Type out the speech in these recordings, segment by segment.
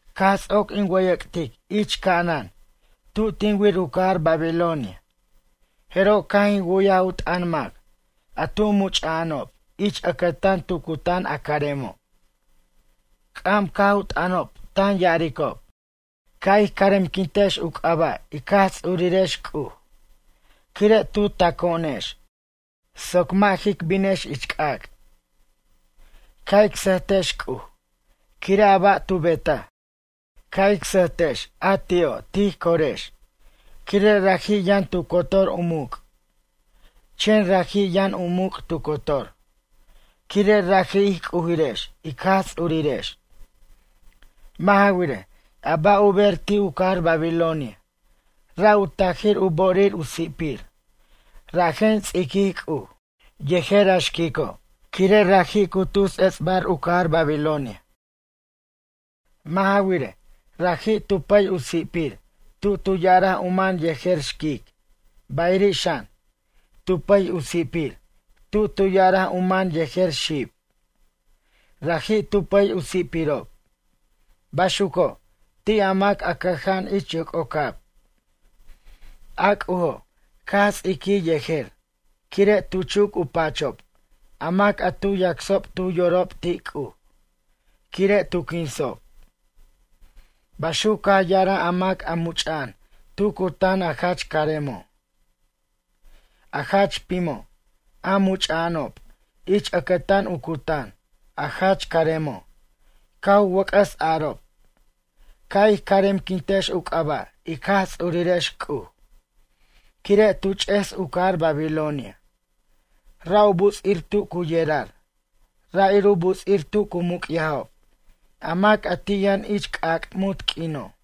Caj ts'oc in wʌyʌc'tic ich ca'anan tu tin wir u cajar Babilonia, jeroj caj in wu'yaj u t'ʌn mac a tu much'a'anob ich ʌcʌtan tu cutan a caremo'. C'am caj u t'ʌnob tan ya'aricob: Ca' ij caremquintex u c'aba' ic Jaj Ts'urirex C'uj, quire' tu taco'onex soc mʌ' jic binex ich c'ac'. Ca' ic sʌjtex C'uj, quire' a ba' tu betaj. Ca' ic sʌjtex a ti'o' tij corex quire' raji' yʌn tu cotor u muc'. Chen raji' yʌn u muc' tu cotor, quire' raji' ij c'ujirex ic Jaj Ts'urirex. Mʌ' ja wirej, a ba' u ber ti' u cajar Babilonia, ra' u tajir u bo'orir u si'pir, rajen ts'iquij C'uj, yejer a xquico', quire' raji' cu tus ets'bar u cajar Babilonia. Mʌ' ja wirej, raji' tu pʌy u si'pir tu tu ya'araj u man yejer xquic, bayiri' xan, tu pʌy u si'pir tu tu ya'araj u man yejer xib. Raji' tu pʌy u si'pirob, baxuco' ti' a mac a cʌja'an ich yoc'ocab. A C'ujo', caj ts'iquij yejer quire' tu chuc u pachob a mac a tu yacsob tu yorob ti' C'uj, quire' tu quinsob. Baxuc caj ya'araj a mac a much'a'an tu cutan a jach caremo'. A jach pimo', a much'a'anob ich ʌcʌtan u cutan, a jach caremo', caj u wʌc'ʌs arob: ―Ca' ij caremquintex u c'aba' ic Jaj Ts'urirex C'uj, quire' tu ch'es u cajar Babilonia. Ra' u buts'ir tu cu yerar, ra' ir u buts'ir tu cu muc'yajob a mac a ti' yʌn ich c'ac' munt q'uino'.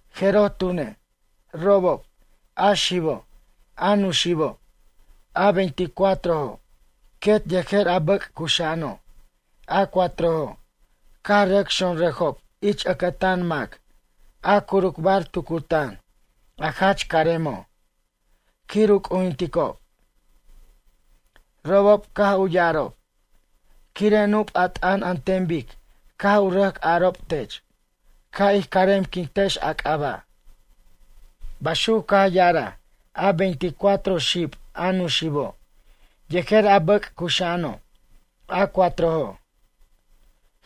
Jeroj tune', robob, a xibo', a nuxibo', a veinticuatrojo', quet yejer a bʌc' cuxa'ano', a cuatrojo', caj rʌc xonrʌjob ich ʌcʌtan mac a curucbar tu cutan, a jach caremo', quir u c'ujinticob. Robob caj u ya'arob: ―Quire' nup' a t'ʌn an ten bic caj u rʌc arob tech, ca' ij caremquintex a c'aba' ―baxuc caj ya'araj a veinticuatro xib, a nuxibo' yejer a bʌc' cuxa'ano', a cuatrojo'.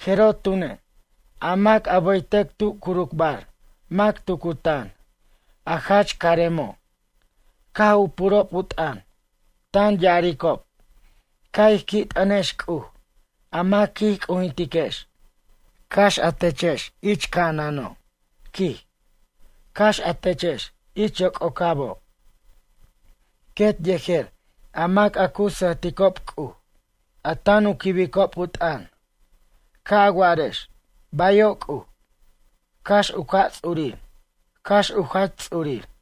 Jeroj tune', a mac a bʌytʌc tu curucbar mac tu cutan, a jach caremo', caj u purob u t'ʌn, tan ya'aricob: Ca' ij qui' t'ʌntex C'uj, a mac quij c'ujintiquex, cax a techex ich ca'anano', quij, cax a techex ich yoc'ocabo'. Quet yejer a mac a cu sʌjticob C'uj, a tan u quibicob u t'ʌn. Ca' a warex: “Bayo' C'uj”, cax u ca' ts'urir, cax u jach ts'urir.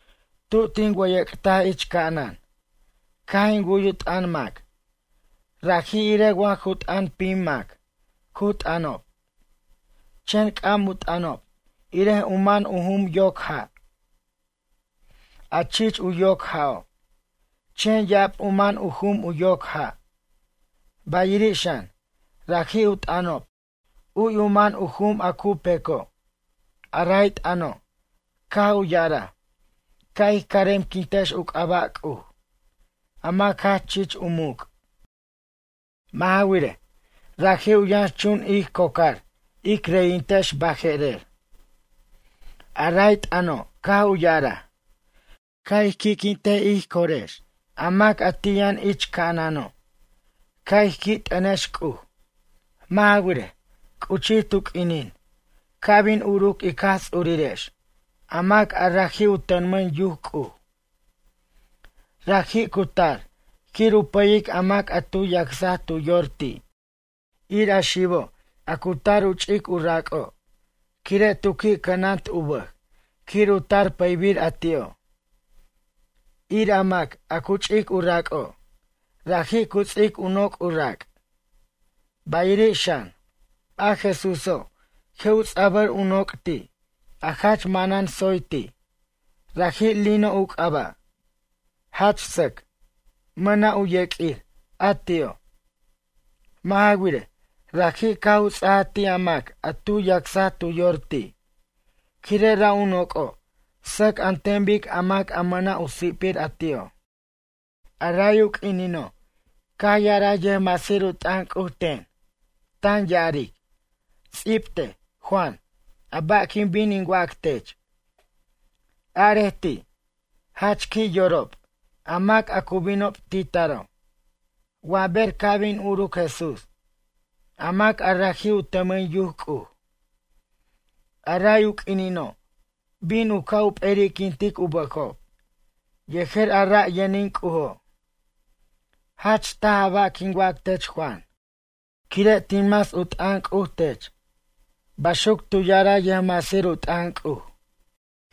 Tu tin wʌyʌc'taj ich ca'anan, caj in wu'y u t'ʌn mac, raji' irej wa ju t'ʌn pim mac cu t'ʌnob. Chen c'am u t'ʌnob irej u man u jum yoc ja', a chich u yoc ja'o', chen ya'ab u man u jum u yoc ja'. Bayiri' xan, raji' u t'ʌnob u'y u man u jum a cu peco'. A ray t'ʌno', caj u ya'araj: Ca' ij caremquintex u c'aba' C'uj, a mac jach chich u muc'. Mʌ' ja wirej, raji' u yʌnxchun ij cocar ic reyintex baje'rer. A ray t'ʌno caj u ya'araj: Ca' ij qui'quint ij corex a mac a ti' yʌn ich ca'anano', ca' ij qui' t'ʌnex C'uj. Mʌ' ja wirej, c'uchij tu q'uinin ca' bin uruc ic Jaj Ts'urirex, a mac a raji' u tʌmʌn yuc C'uj. Raji' cu tar quir u pʌyic a mac a tu yacsaj tu yor ti', ir a xibo' a cu tar ch' u rac'o', quire' tu qui' cʌnant u bʌj quir u tar pʌybir a ti'o'. Ir a mac a cu ch'ic u rac'o', raji' cu ts'ic u noc' u rac'. Bayiri' xan, a Jesúso' je' u ts'abʌr u noc' ti', a jach manan tsoy ti', raji' lino u c'aba'. Jach sʌc, mʌna' u yeq'uir a ti'o'. Mʌ' ja wirej, raji' caj u ts'ajaj ti' a mac a tu yacsaj tu yor ti', quire' ra' u noc'o' sʌc an ten bic a mac a mʌna' u si'pir a ti'o'. A ray u q'uinino' caj ya'araj yʌjmasir u t'ʌn C'uj ten, tan ya'aric: ―Ts'ibtej, Juan, a ba' quin bin in wac tech. Arej ti': Jach qui' yorob a mac a cu binob titaro', wa ber ca' bin uruc Jesús, a mac a raji' u tʌmʌn yuc C'uj. A ray u q'uinino', bin u ca' u p'eri'quint u bʌjob yejer a ra' yʌnin C'ujo'. Jach taj a ba' quin wac tech Juan, quire' tin mas u t'ʌn C'uj tech ―baxuc tu ya'araj yʌjmasir u t'ʌn C'uj.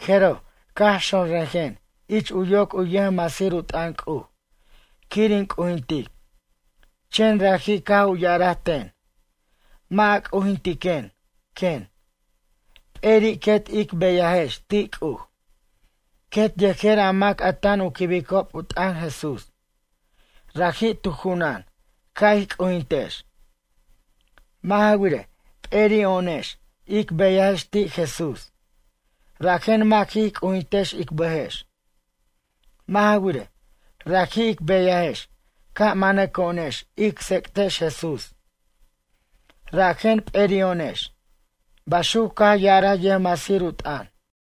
Jeroj, caj xonrʌjen ich u yoc u yʌjmasir u t'ʌn C'uj quir in c'ujintic. Chen raji' caj u ya'araj ten: ―Mʌ' a c'ujintiquen ―quen―. P'eri' quet ic beyajex ti' C'uj, quet yejer a mac a tan u quibicob u t'ʌn Jesús. Raji' tu junan ca' ij c'ujintex. Mʌ' ja wirej, p'eri'o'onex ic beyajex ti' Jesús, rajen mʌ' jic c'ujintej ic bʌjex. Mʌ' ja wirej, raji' ic beyajex ca' manaco'onex ic tsec'tex Jesús rajen p'eri'o'onex ―baxuc caj ya'araj yʌjmasir u t'ʌn.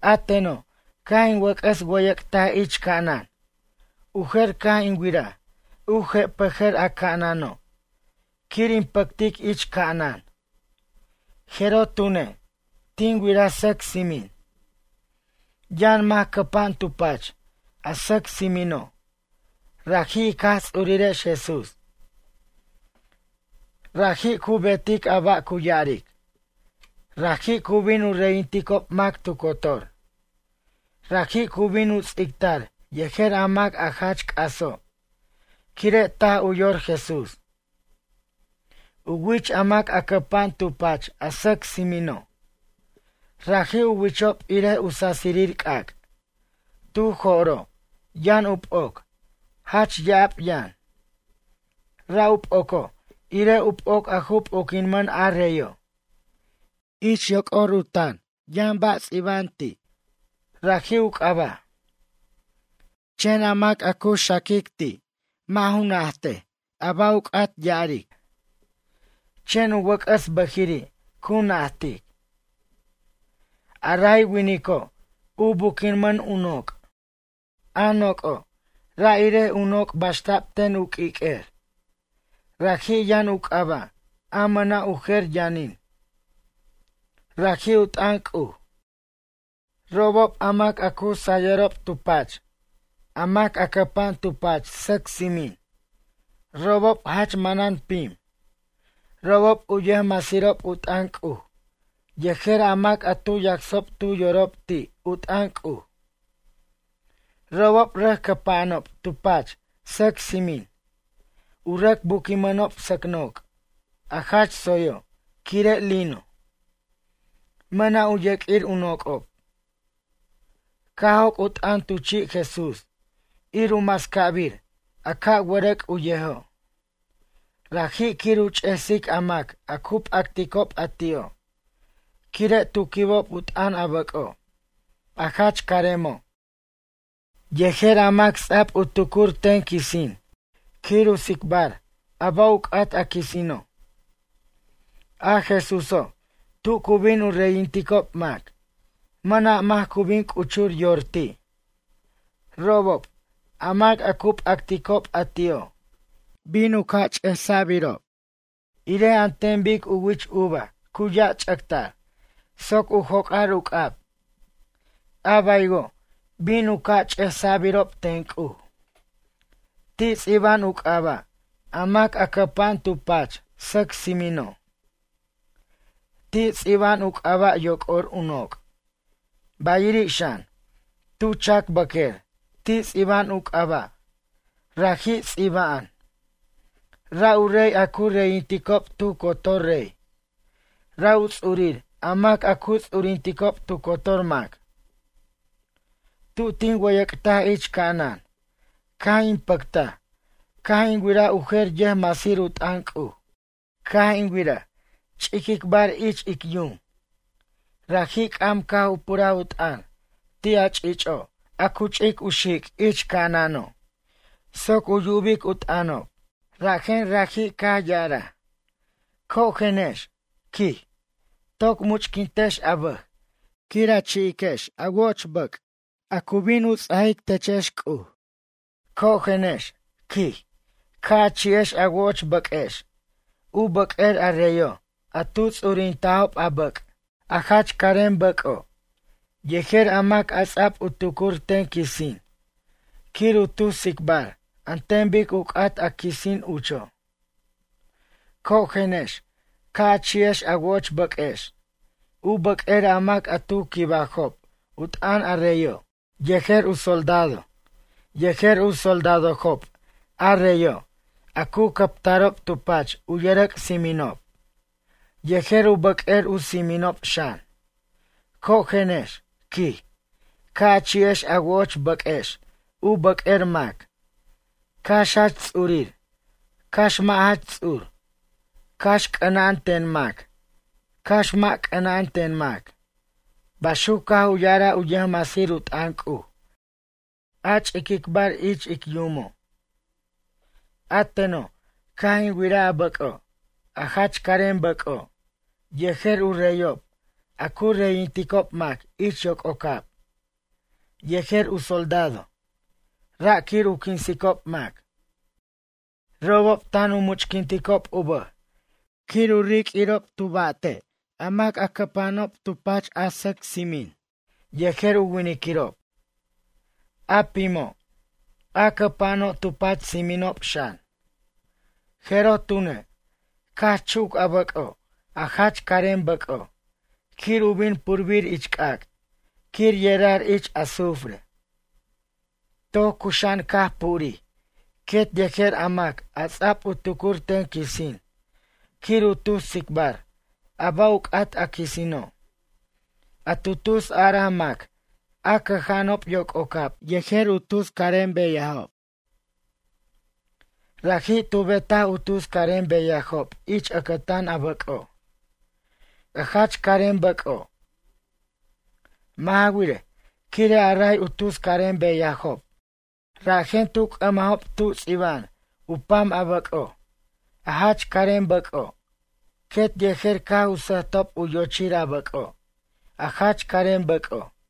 A teno', caj in wʌc'ʌs wʌyʌc'taj ich ca'anan. U jer, caj in wiraj u je'pʌjʌr a ca'anano' quir in pʌctic ich ca'anan. Jeroj tune', tin wiraj sʌc tsimin. Yʌn mac cʌpa'an tu pach a sʌc tsimino', raji' ic Jaj Ts'urirex Jesús. Raji' cu betic a ba' cu ya'aric. Raji' cu bin u reyinticob mac tu cotor. Raji' cu bin u ts'ictar yejer a mac a jach c'aso' quire' taj u yor Jesús. U wich a mac a cʌpa'an tu pach a sʌc tsimino'. Raji' u wichob irej u sasirir c'ac'. Tu jo'ro', yʌn u p'oc, jach ya'ab yʌn. Ra' u p'oco' irej u p'oc a ju p'oquinmʌn a reyo'. Ich yoc'or u tan yʌn ba' ts'iba'an ti'. Raji' u c'aba'. Chen a mac a cu xaquic ti', mʌ' ju najtej ba' u c'at ya'arej. Chen u wʌc'ʌs bʌjiri' cu najtic. A ray winico', u buquinmʌn u noc'. A noc'o', raji' irej u noc' baxta'b ten u q'uiq'uer. Raji' yʌn u c'aba' a mʌna' u jer yʌnin. Raji' u t'ʌn C'uj. Robob a mac a cu sayʌrob tu pach, a mac a cʌpa'an tu pach sʌc tsimin, robob jach manan pim, robob u yʌjmasirob u t'ʌn C'uj yejer a mac a tu yacsob tu yorob ti' u t'ʌn C'uj. Robob rʌc cʌpa'anob tu pach sʌc tsimin, u rʌc buquinmʌnob sʌc noc' a jach tsoyo' quire' lino. Mʌna' u yeq'uir u noc'ob. Caj joc' u t'ʌn tu chi' Jesús ir u mascabir a ca' wʌrʌc' u yejo'. Raji' quir u ch'esic a mac a cu p'acticob a ti'o', quire' tu quibob u t'ʌn a bʌco', a jach caremo', yejer a mac ts'a'b u tucur ten quisin quir u tsicbar a ba' u c'at a quisino'. A Jesúso', tu cu bin u reyinticob mac, mʌna' mac cu bin c'uchur yor ti'. Robob, a mac a cu p'acticob a ti'o', bin u ca' ch'esa'birob irej an ten bic u wich uva cu yach'ʌtʌr soc u joc'ar u c'ab, a baywo' bin u ca' ch'esa'birob ten C'uj. Ti' ts'iba'an u c'aba' a mac a cʌpa'an tu pach sʌc tsimino'. Ti' ts'iba'an u c'aba' yoc'or u noc', bayiri' xan, tu chacbʌq'uer ti' ts'iba'an u c'aba'. Raji' ts'iba'an. “Ra' u rey a cu reyinticob tu cotor rey. Ra' u ts'urir a mac a cu ts'urinticob tu cotor mac.” Tu tin wʌyʌc'taj ich ca'anan, caj in pʌctaj caj in wiraj u jer yʌjmasir u t'ʌn C'uj. Caj in wiraj, ch'iquicbar ich ic yum. Raji' c'am caj u puraj u t'ʌn ti' a ch'icho', a cu ch'ic u xic' ich ca'anano', soc u yubic u t'ʌnob. Rajen raji' caj ya'araj: ―Cojenex ―quij―, toc much'quintex a bʌj quir a chi'iquex a wo'och bʌc' a cu bin ts'ajic techex ten C'uj. Cojenex ―quij―, ca' a chi'ex a wo'och bʌq'uex, u bʌq'uer a reyo' a tu ts'urintajob a bʌc', a jach carem bʌc'o', yejer a mac a ts'a'b u tucur ten quisin quir u tus tsicbar an ten bic u c'at a quisin ucho'. Cojenex ca' a chi'ex a wo'och bʌq'uex, u bʌq'uer a mac a tu quibajob u t'ʌn a reyo', yejer u soldadob, yejer u soldadojob a reyo' a cu cʌptarob tu pach u yʌrʌc' tsiminob, yejer u bʌq'uer u tsiminob xan. Cojenex ―quij―, ca' a chi'ex a wo'och bʌq'uex u bʌq'uer mac, cax jach ts'urir, cax mʌ' jach ts'ur, cax c'ʌna'an ten mac, cax mʌ' c'ʌna'an ten mac ―baxuc caj u ya'araj u yʌjmasir u t'ʌn C'uj, a ch'iquicbar ich ic yumo'. A teno', caj in wiraj a bʌc'o', a jach carem bʌco', yejer u reyob a cu reyinticob mac ich yoc'ocab, yejer u soldado, ra' quir u quinsicob mac. Robob tan u much'quinticob u bʌj quir u riq'uirob u ba'te't a mac a cʌpa'ano' tu pach a sʌc tsimin yejer u winiquirob, a pimo', a cʌpa'ano' tu pach tsiminob xan. Jeroj tune', caj chuc a bʌc'o', a jach carem bʌc'o' quir u bin purbir ich c'ac' quir yerar ich azufre. Toc cuxa'an caj purij quet yejer a mac a ts'a'b u tucur ten quisin quir u tus tsicbar a ba' u c'at a quisino', a tu tus araj mac a cʌja'anob yoc'ocab yejer u tus carem beyajob. Raji' tu betaj u tus carem beyajob ich ʌctan a bʌc'o', a jach carem bʌc'o'. Mʌ' ja wirej, quire' a ray u tus carem beyajob, rajen tu c'ʌmajob tu ts'iba'an u pam a bʌc'o', a jach carem bʌc'o' quet yejer caj u sʌjtob u yochir a bʌc'o', a jach carem bʌc'o'.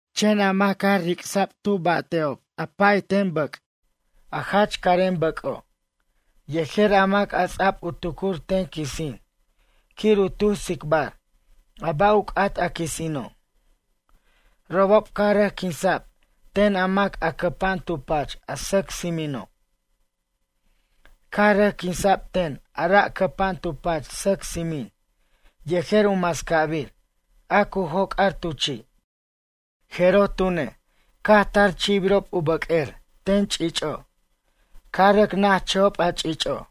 Chen a mac caj ricsa'b tu ba'te'ob a pa'ay ten bʌc', a jach carem bʌc'o' yejer a mac a ts'a'b u tucur ten quisin quir u tus tsicbar a ba' u c'at a quisino'. Robob caj rʌc quinsa'b ten a mac a cʌpa'an tu pach a sʌc tsimino'. Caj rʌc quinsa'b ten a ra' cʌpa'an tu pach sʌc tsimin yejer u mascabir a cu joc'ar tu chi'. Jeroj tune', caj tar chi'birob a u bʌq'uer ten ch'ich'o', caj rʌc najchʌjob a ch'ich'o'.